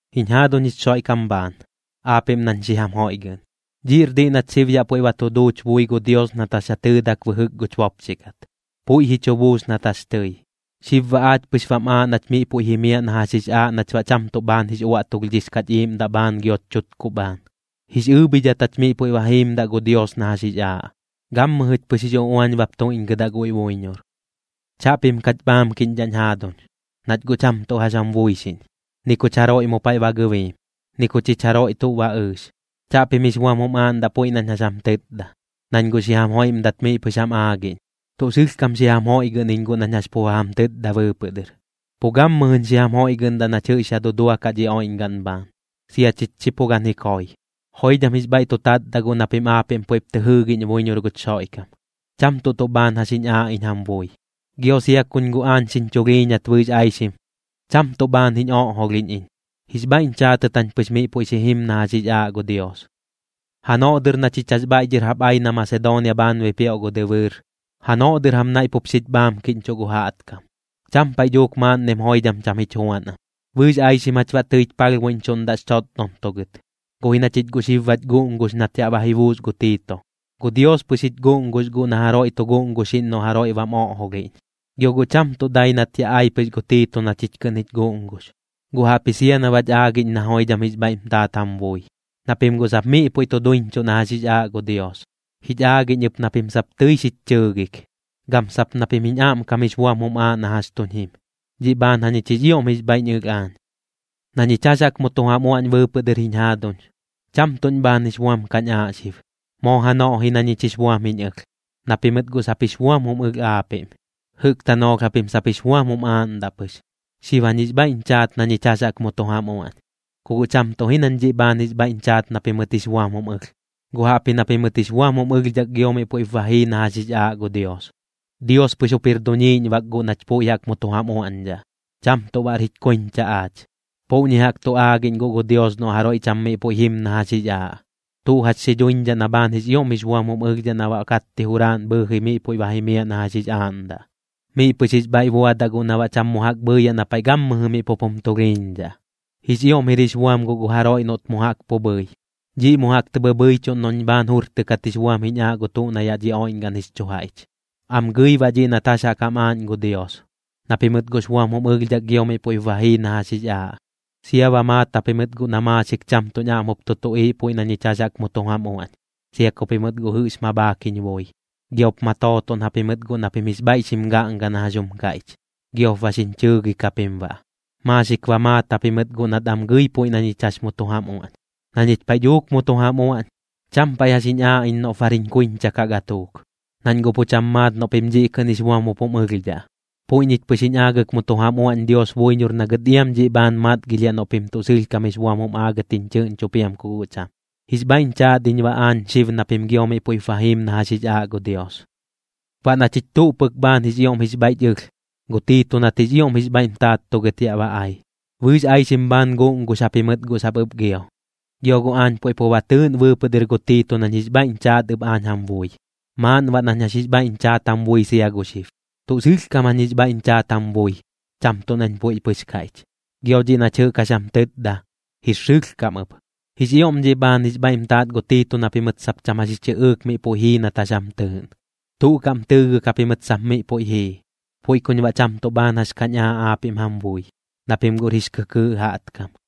Jiñ jaaduñ jich Xoiꞌkam bhaan, aapiꞌm nañ xi jam joiꞌgɨꞌn, dhiꞌr diꞌ nat xib yaꞌ puiꞌ ba tu duuch bui gu Dios nat jax ja tɨɨdak bɨjɨk guch bopxi kat, puiꞌ ji chu buus nat jax tɨi. Xib baꞌ aach pɨx bam aaꞌ nach miꞌ puiꞌ jimiaꞌ na jax jix aaꞌ nach baꞌ cham tuꞌ bhaan jix uꞌuaꞌtulhdhix kaꞌch iiꞌmdaꞌ bhaan gioch chutkuꞌ bhaan. Jix ɨɨbhidhat jach miꞌ puiꞌ ba jiimdaꞌ gu Dios na jax jix aaꞌ, gammɨjɨch pɨx jix uꞌuañ bap tuiꞌñgɨdaꞌ guiꞌ buiñor. Chaꞌpim kach bhaamkiꞌñdhaꞌñ jaaduñ, nach guꞌ cham tuꞌ jax jam buixiꞌñ, ni kuch jaroiꞌ mu paiꞌ ba gɨbiim, ni ku chich jaroiꞌ tuꞌ ba ɨɨx. Chaꞌpim jix buam jum aaꞌndaꞌ puiꞌ nañ jax jam tɨtda, nañ guꞌ xi jam joiꞌmdat miꞌ pɨx jam aagiꞌñ. Tuꞌ sɨlhkam xi jam joiꞌgɨꞌn iñ guꞌ nañ jax pu ba jam tɨtda bɨɨpɨꞌ dɨr, pu gammɨjɨñ xi jam joiꞌgɨꞌndaꞌ nach jɨꞌx ya duduakaꞌ dhi oiꞌñgaꞌn bhaan, sia chich chi pu gan ji koi. Joidham jix bhaiꞌ tu tatdaꞌ guꞌ na pim aapiꞌm puiꞌp tɨ jɨɨgiꞌñ buiñor guch Xoiꞌkam, cham tuꞌ tuꞌ bhaan jax jiñ aaꞌ iñ jam bui. Gio sia kuñ guꞌ aañ xiñ chulhiiñat bɨɨx aixim, cham tuꞌ bhaan jiñ oꞌjolhiꞌñ iñ, jix bhaiꞌñ chaatɨt jañ pɨx miꞌ puiꞌ xi jim na jax jix aaꞌ gu Dios. Janoꞌ dɨr na chich jax bhaiꞌ dhɨr jaꞌp ai na Masedoonia bhaan bipioꞌ gu dɨbɨɨr, janoꞌ dɨr jam naiꞌ pup xich bhaamkiꞌñchuꞌ gu jaꞌtkam, cham paiꞌ dhuuk maaꞌnnim joidham cham jich juan am. Bɨɨx aixim jach baꞌ tɨich palhbuiꞌñchuꞌndaꞌx chotdontugɨt. Guꞌ ji na chich guꞌ xib bach guꞌngux nat yaꞌ ba ji buus gu Tiito, gu Dios pɨx jich guꞌngux guꞌ na jaroiꞌ tu guꞌnguxiꞌñ noꞌ jaroiꞌ bam oꞌjolhiꞌñ. Gio guꞌ cham tuꞌ dai nat ya ai pɨx gu Tiito na chich kɨꞌn jich guꞌngux, guꞌ jaꞌpji sia na bach aagiꞌñ na joidham jix bhaiꞌm taat jam bui, na pim guꞌ sap miꞌ puiꞌ tu duiñchuꞌ na jax jix aaꞌ gu Dios. Jich aagiꞌñ ɨp na pim sap tɨi xich chɨɨgik, gam sap na pim jiñ aꞌmkam jix buam jum aaꞌ na jax tuñ jim, dhiꞌ bhaan jañich jix ioꞌm jix bhaiꞌñ ɨlh aañ. Na ñich jax jaꞌk mu tu jam uaꞌñ bɨɨpɨꞌ dɨr jiñ jaaduñ, cham tuꞌñ bhaan jix buam kañ aaꞌ xib, moo janoꞌ ji na ñich jix buam jiñ ɨlh, na pimɨt guꞌ sap jix buam jum ɨlh aapiꞌm. Jɨꞌk tanoolh japim sap jix buam jum aaꞌndaꞌ pɨx. Xib jañ jix bhaiꞌñ chaat na ñich jax jaꞌk mu tu jam uaꞌñ, ku guꞌ cham tuꞌ ji nañ dhiꞌ bhaan jix bhaiꞌñ chaat na pimɨt jix buam jum ɨlh, guꞌ jaꞌpji na pimɨt jix buam jum ɨlhdhak gio miꞌ puiꞌp ba jii na jax jix aaꞌ gu Dios. Dios pɨx jup jir duñiiꞌñ bak guꞌ nach puiꞌ jaꞌk mu tu jam uaꞌñdhaꞌ, cham tuꞌ baꞌr jich kuiñcha aach. Puꞌñi jaꞌk tu aagiꞌñ guꞌ gu Dios noꞌ jaroiꞌ cham miꞌ puiꞌ jim na jax jix aaꞌ, tuꞌ jax xi dhuiñdhaꞌ na bhaan jix ioꞌm jix buam jum ɨlhdhaꞌ na baꞌ katti juraaꞌn bhɨɨji miꞌ puiꞌ ba jimiaꞌ na jax jix aaꞌndaꞌ. Miꞌ pɨx jix bhaiꞌ buadaꞌ guꞌ na baꞌ cham mu jaꞌk bhɨɨyaꞌ na paiꞌ gammɨjɨ miꞌ pup jum tulhiiñdhaꞌ. Jix ioꞌm jir jix buam guꞌ gu jaroiꞌ noꞌt mu jaꞌk pu bhɨi, dhiꞌ mu jaꞌk tɨ bhɨbhɨichuꞌn noꞌñ bhaan jurtɨkat jix buam jiñ aaꞌ gu tuꞌ na yaꞌ dhi oiꞌñgaꞌn jix chu jaiꞌch. Am gɨi baꞌ dhiꞌ nat jax jaꞌk jam aaꞌñ gu Dios, na pimɨt guꞌx buam jum ɨlhdhak gio miꞌ puiꞌp ba jii na jax jix aaꞌ. Sia ba maat japimɨt guꞌ na maaxik cham tuꞌñ aꞌm jup tu tuꞌiiꞌ puiꞌ na ñich jax jaꞌk mu tu jam uaꞌñ, sia ku pimɨt guꞌ jɨꞌx ma bhaak jiñ bui. Giop ma tootoꞌn japimɨt guꞌ na pim jix bhaiꞌ xim gaꞌnga na jax jum kaiꞌch, giop ba xiñ chɨɨgik japim baꞌ. Maaxik ba maat japimɨt guꞌ nat am gɨi puiꞌ na ñich jax mu tu jam uaꞌñ. Na ñich paiꞌ dhuuk mu tu jam uaꞌñ, cham paiꞌ jax jiñ aaꞌ iñ noꞌp bar jiñ kuiñcha kaꞌ gatuuk, nañ guꞌ pu cham maat noꞌ pim dhiꞌ kɨꞌn jix buam jup jum ɨlhdhaꞌ. Puiꞌ ñich pɨx jiñ aagɨk mu tu jam uaꞌñ Dios buiñor na gɨt iam dhiꞌ bhaan matgilhiaꞌ noꞌ pim tuꞌ sɨlhkam jix buam jum aagɨt jich chɨꞌñcho piam ku guꞌ cham. Jix bhaiꞌñ chaat iñ baꞌ aañ xib na pim gio miꞌ puiꞌp ba jiim na jax jix aaꞌ gu Dios. Baꞌ na chich tuꞌ pɨk bhaan jix ioꞌm jix bhaiꞌch ɨlh, gu Tiito nat jix ioꞌm jix bhaiꞌm taattugɨt yaꞌ ba ai, bɨɨx aixim bhaan guꞌngux japimɨt guꞌ sap ɨp gio. Gio guꞌ aañ puiꞌ pu ba tɨɨꞌn bɨɨpɨꞌ dɨr gu Tiito nañ jix bhaiꞌñ chaat ɨp aañ jam bui, maaꞌn baꞌ nañ jax jix bhaiꞌñ chaat jam bui sia gu xib. Tuꞌ sɨlhkam jañ jix bhaiꞌñ chaat jam bui, cham tuꞌ nañ puiꞌ pɨx kaiꞌch, gio dhiꞌ nach jɨꞌk jax jam tɨtda, jir sɨlhkam ɨp. Jix ioꞌm dhiꞌ bhaan jix bhaiꞌm taat gu Tiito na pimɨt sap cham jax ji chɨꞌɨɨk miꞌ puiꞌ jii nat jax jam tɨɨꞌn, tuꞌ kaꞌm tɨɨgɨk japimɨt sap miꞌ puiꞌ jii. Puiꞌ kuñ baꞌ cham tuꞌ tuꞌ bhaan jax kañ aaꞌ aapiꞌm jam bui, na pim guꞌr jix kɨkɨɨꞌ jaꞌtkam.